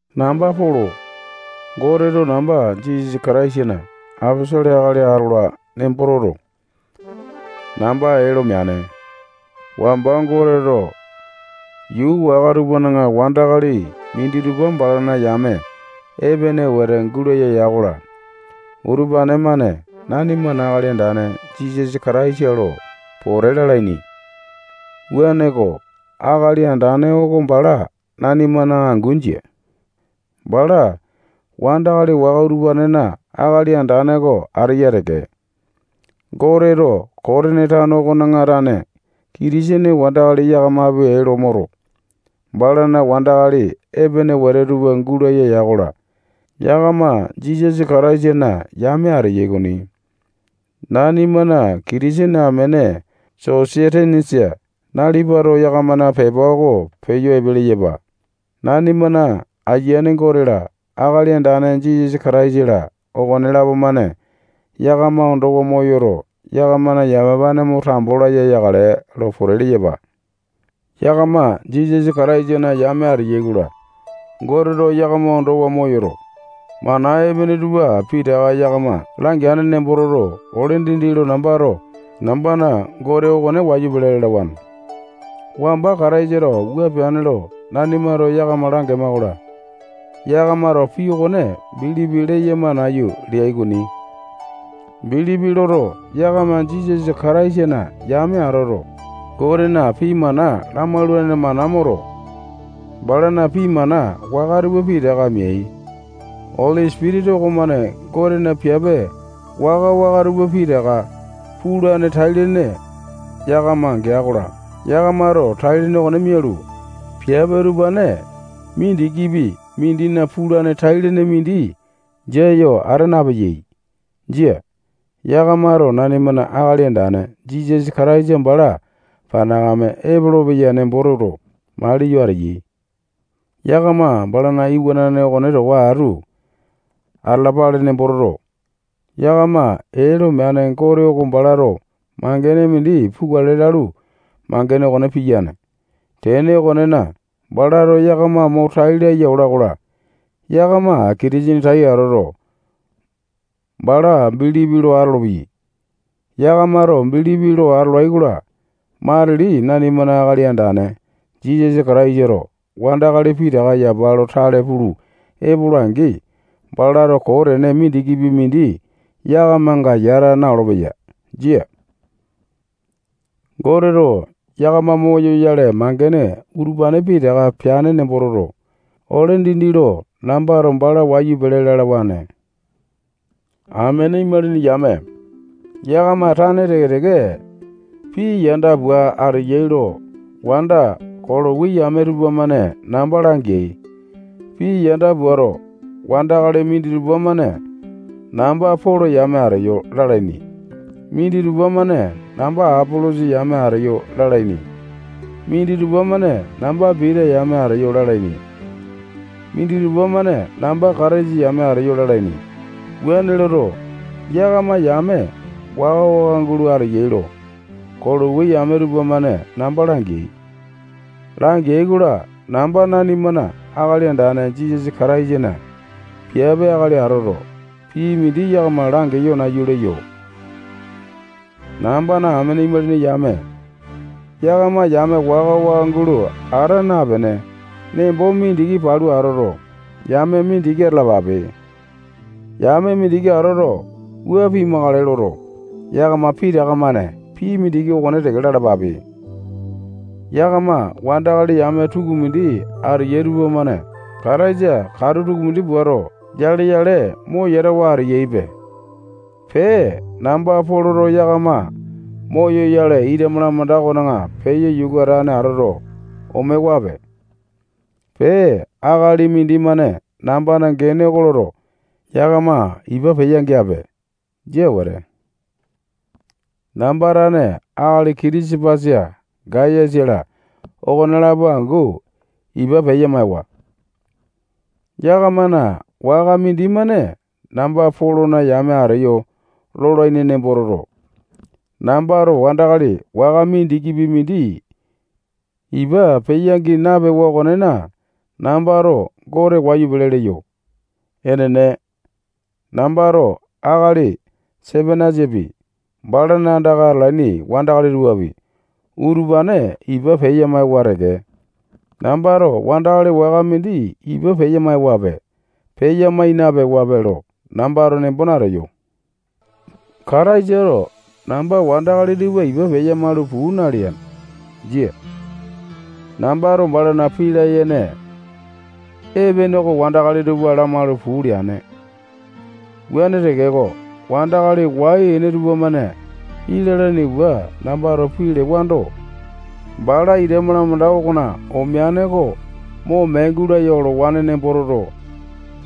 Namba Polo. Goteto namba Jisasa Kataisana aposolo akali atola nembo toto, namba ee lo meane. Wamba Goteto yuu waka tupana wandakali minditupa balana yame epene wete gulaya ya-kola, utupane-mane nanimana Akali Andane Jisasa Kataisa lo pote lalaini. Wuaneko, Akali Andane oko bala nanimana angu jia. Bala wandakali waka utupanena Akali Andane oko ateya teke. Goteto Kotini tano okona tane Kitisene wandakali yakamapi ee lo moto, balana wandakali epene wete tupa gulaya ya-kola, yakama Jisasa Kataisana yame ateyai okoni. Nanimana Kitisene amene Sosetenesa nalipato yakamana pepa oko peyo epe leyapa. Nanimana Ayiane Gote-la, Akali Andane Jisasa Kataisa-la, okonelapo-mane yakama ondowa moyoto, yakamana yamapane mo tambo laya yakale lo pote leyapa. Yakama Jisasa Kataisana yame ateyai-kola, Goteto yakama ondowa moyoto, mana epene tupa pitaka yakama langeane nembo toto, ole dindi lo nambato nambana Gote okone wayu pele lalawane. Wamba Kataisato wua peane lo nanimato yakama langema-kola, yakamato pii okone bilipi leyama nayu leai okoni. Bilipi loto, yakama Jisasa Kataisana yame atoto, Gotena pii mana lamaulane mana moto, balana pii mana waka tupa pitaka meai. Oli Sipitisa okomane Gotena piape waka-waka tupa pitaka pulane tai-lene yakama gea-kola, yakamato tai-lene okone mialu, piape utupane mindikipi mindina pulane tai-lene mindi jia yo ata napeyai. Jia. Yakamato nanimana Akali Andane Jisasa Kataisa bala panakame epolopeya nembo toto, maliyo ateyai. Yakama balana iwanane okone towa atu atalapale nembo toto, yakama ee lo meane Gote oko balato mangene mindi pukale lalu, mangene okone piyane. Tene okonena, balato yakama mo tai laya ola-kola, yakama Kitisene tai atoto, bala bilipi lo atolopeyai. Yakamato bilipi lo atolai-kola, matili nanimana Akali Andane Jisasa Kataisato wandakali pitaka yapa lo tale pulu epola-angi, balato koo tene mindikipi mindi yakamanga yata na-olopeya. Jia. Goteto yakama moyoyale mangene utupane pitaka peane nembo toto, ole dindi lo nambato bala wayu pele lalawane. Amene imalini yame, yakama tane teke-teke pii yanda pua ateyai lo wanda Kolowi yame tupamane namba langeai. Pii yanda puato, wandakali minditupa-mane namba Polo yame ateyo lalaini. Minditupa-mane namba Apolosa yame ateyo lalaini. Minditupa-mane namba Pita yame ateyo lalaini. Minditupa-mane namba Kataisa yame ateyo lalaini. Wuane loto, yakama yame waka-waka gulo ateyai lo, Kolowi yame tupamane namba langeai. Langeai-kola, namba nanimana Akali Andane Jisasa Kataisana piape akali atoto, pii mindi yakama langeyo nayu leyo. Nambana amene imalini yame, yakama yame waka-waka gulo ata napene, nembo mindiki palu atoto, yame mindiki atalalape. Yame mindiki atoto, wua pimakale loto, yakama pitaka-mane pii mindiki okone teke lalapape. Pee, yakama wandakali yame tukumindi ateyai tupamane Kataisa katu tukumindi puato, yale-yale mo yatawa ateyaipe. Pee, namba Poloto yakama moyoyale ita malamanda okona peyo yuka atane atoto, omewape. Pee, akali mindimane nambana gene oko loto, yakama ipa peya-geape. Jia wete. Namba tane akali Kitisapasa, Gayasa-la okonelapo angu ipa peya-maewa. Yakamana waka mindimane namba Polona yame ateyo lolaini nembo toto, nambato wandakali waka mindikipi mindi ipa peya-gii napewa okonena, nambato Gote wayu pele leyo. Enene, nambato akali Sepanasapi, balana andaka atalaini wandakali tupapi, utupane ipa peya-maewa teke. Nambato wandakali waka mindi ipa peya maewape, peya mai napewape lo nambato nembo nateyo. Kataisato namba wandakali tupa ipa peya-maulu puu nalea. Jia. Nambato balana pii layene epene oko wandakali tupa lamaulu puu leane. Wuane tekeko, wandakali wai-ene tupamane pii lalaini pua nambato pii lewando, bala ita malamanda okona omeane oko mo mee gulaya olowane nembo toto,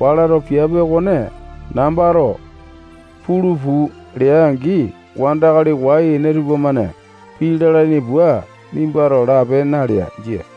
balato piape okone nambato pulu puu lea-angi, wandakali wai-ene tupamane pii lalaini pua nimbato lape nalea. Jia.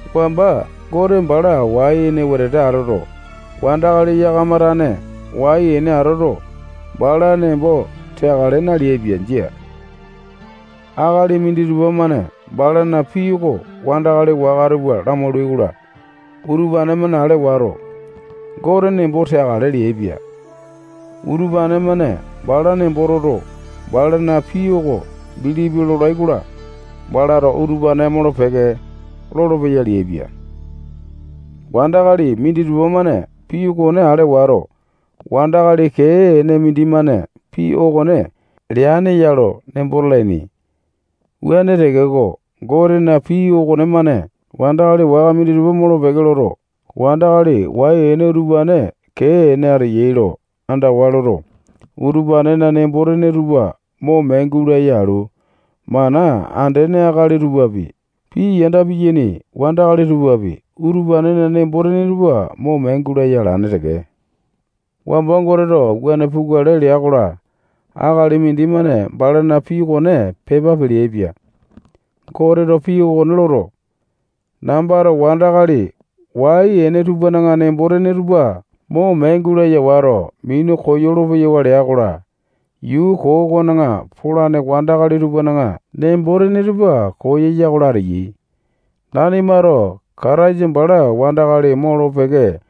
Wamba Gote bala wai-ene wetete atoto, wandakali yakama tane wai-ene atoto, bala nembo teakale naleaipia. Jia. Akali minditupa-mane balana pii oko wandakali waka tupa lamaulai-kola, utupane-mane ale wato, Gote nembo teakale leaipia. Utupane-mane bala nembo toto, balana pii oko bilipi lolai-kola, balato utupane molo-peke lolopeya leaipia. Wandakali minditupa-mane pii okone ale wato, wandakali kee ene mindimane pii okone leane ya lo nembo talaini. Wuane tekeko, Gotena pii okonemane wandakali waka minditupa molo-peke loto, wandakali wai-ene utupane kee-ene ateyai lo andawa loto, utupanena nembo-tene tupa mo mee gulaya alu, mana andene akali tupapi, pii yanda piyaini wandakali tupapi, utupanena nembo-tene tupa mo mee gulaya alane teke. Wamba Goteto wuane pukale lea-kola, akali mindimane balana pii okone pepa peleaipia. Goteto pii okone loto, nambato wandakali wai-ene tupana nembo-tene tupa mo mee gulaya wato, minu koyolo-peyawa lea-kola, yuu koo okona poyale wandakali tupana nembo-tene tupa koyatane ateyai. Nanimato Kataisa bala wandakali molo-peke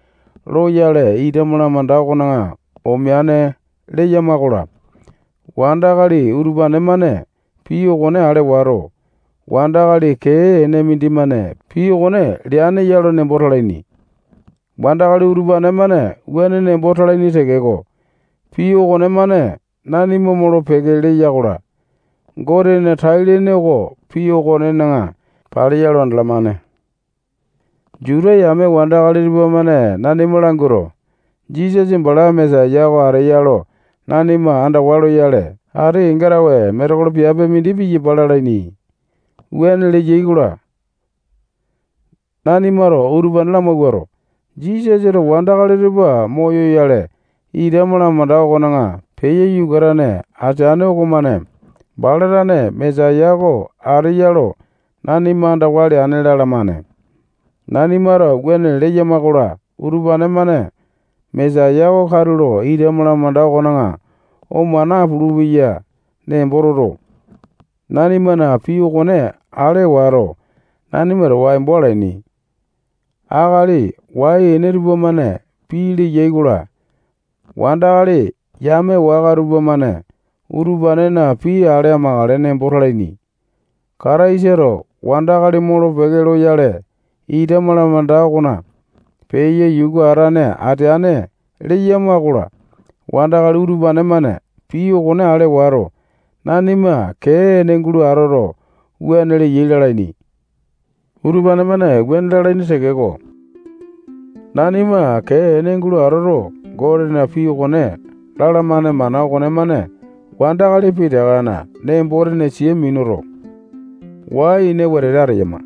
loyale, ita malamanda okona omeane leyama-kola, wandakali utupane-mane pii okone ale wato, wandakali kee ene mindimane pii okone leane ya lo nembo talaini. Wandakali utupane-mane wuane nembo talaini tekeko, pii okonemane nanima molo-peke leya-kola, Gotena tai-lene oko pii okonena paleya lo andalamane. Juta yame wandakali tupamane nanima languato, Jisasa bala Mesaya oko ateya lo nanima andawa loyale, ati kenga tawe metekolo piape mindi piyapa lalaini. Wuane leyai-kola, nanimato utupane lamawuato, Jisasato wandakali tupa moyoyale, ita malamanda okona peyo yuka atane ateane okomane bala tane Mesaya oko ateya lo nanima andawa leane lalamane. Nanimato wuane leyama-kola, utupane-mane Mesaya oko katulo ita malamanda okona oma napulu-peya nembo toto, nanimana pii okone ale wato, nanima towa embo alaini. Akali wai-ene tupamane pii leyai-kola, wandakali yame waka tupamane utupanena pii ale amakale nembo talaini. Kataisato wandakali molo-peke loyale, ita malamanda okona peyo yuka atane ateane leyama-kola, wandakali utupane-mane pii okone ale wato, nanima kee-ene gulo atoto, wuane leyai lalaini. Utupane-mane wuane lalaini tekeko, nanima kee ene gulo atoto, Gotena pii okone lalamane mana okonemane wandakali pitakana nembo-tene tupa sia minuto, wai-ene wetete ateyama.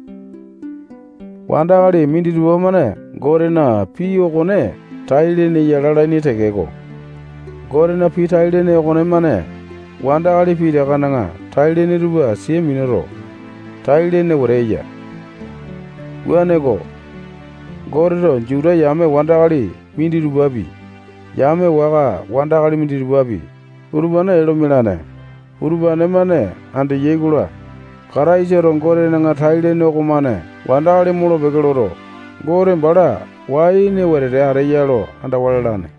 Wandakali minditupa-mane Gotena pii okone tai-lene ya lalaini tekeko, Gotena pii tai-lene okonemane wandakali pitakana tai-lene tupa sia minuto, tai-lene wete eya. Wuaneko, Goteto Juta yame wandakali minditupapi, yame waka wandakali minditupapi, utupane ee lo mialane. Uupane-mane andeyai-kola, Kataisato Gotena tai-lene okomane wandakali molo-peke loto, Gote bala wai-ene wetete ateya lo andawa lalane.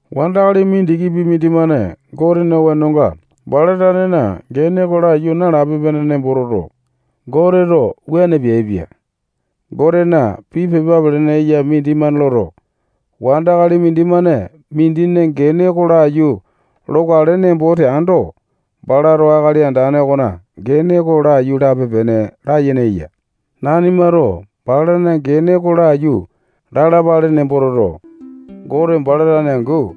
Wandakali mindikipi mindimane Gotena wenonga, bala tanena gene oko laiyu nalape-pene nembo toto, Goteto wuane peaipia. Gotena pii pepa pelene eya mindimane loto, wandakali mindimane mindina gene oko laiyu lokale nembo teando, balato Akali Andane okona gene oko laiyu lape-pene layene eya. Nanimato balana gene oko laiyu lalapale nembo toto, Gote bala tane angu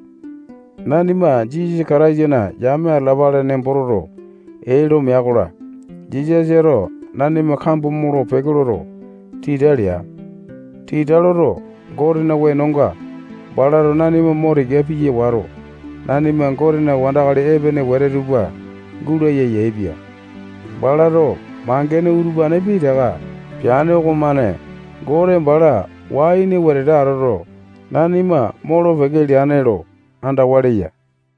nanima Jisasa Kataisana yame atalapale nembo toto, ee lo mea-kola, Jisasato nanima kambo molo-peke loto, tita lea. Tita loto, Gotena wenonga balato nanima mo tika piya wato, nanima Gotena wandakali epene wete tupa gulaya yaepia. Balato mangene utupane pitaka peane okomane Gote bala wai-ene wetete atoto, nanima molo-peke leane lo andawa leya.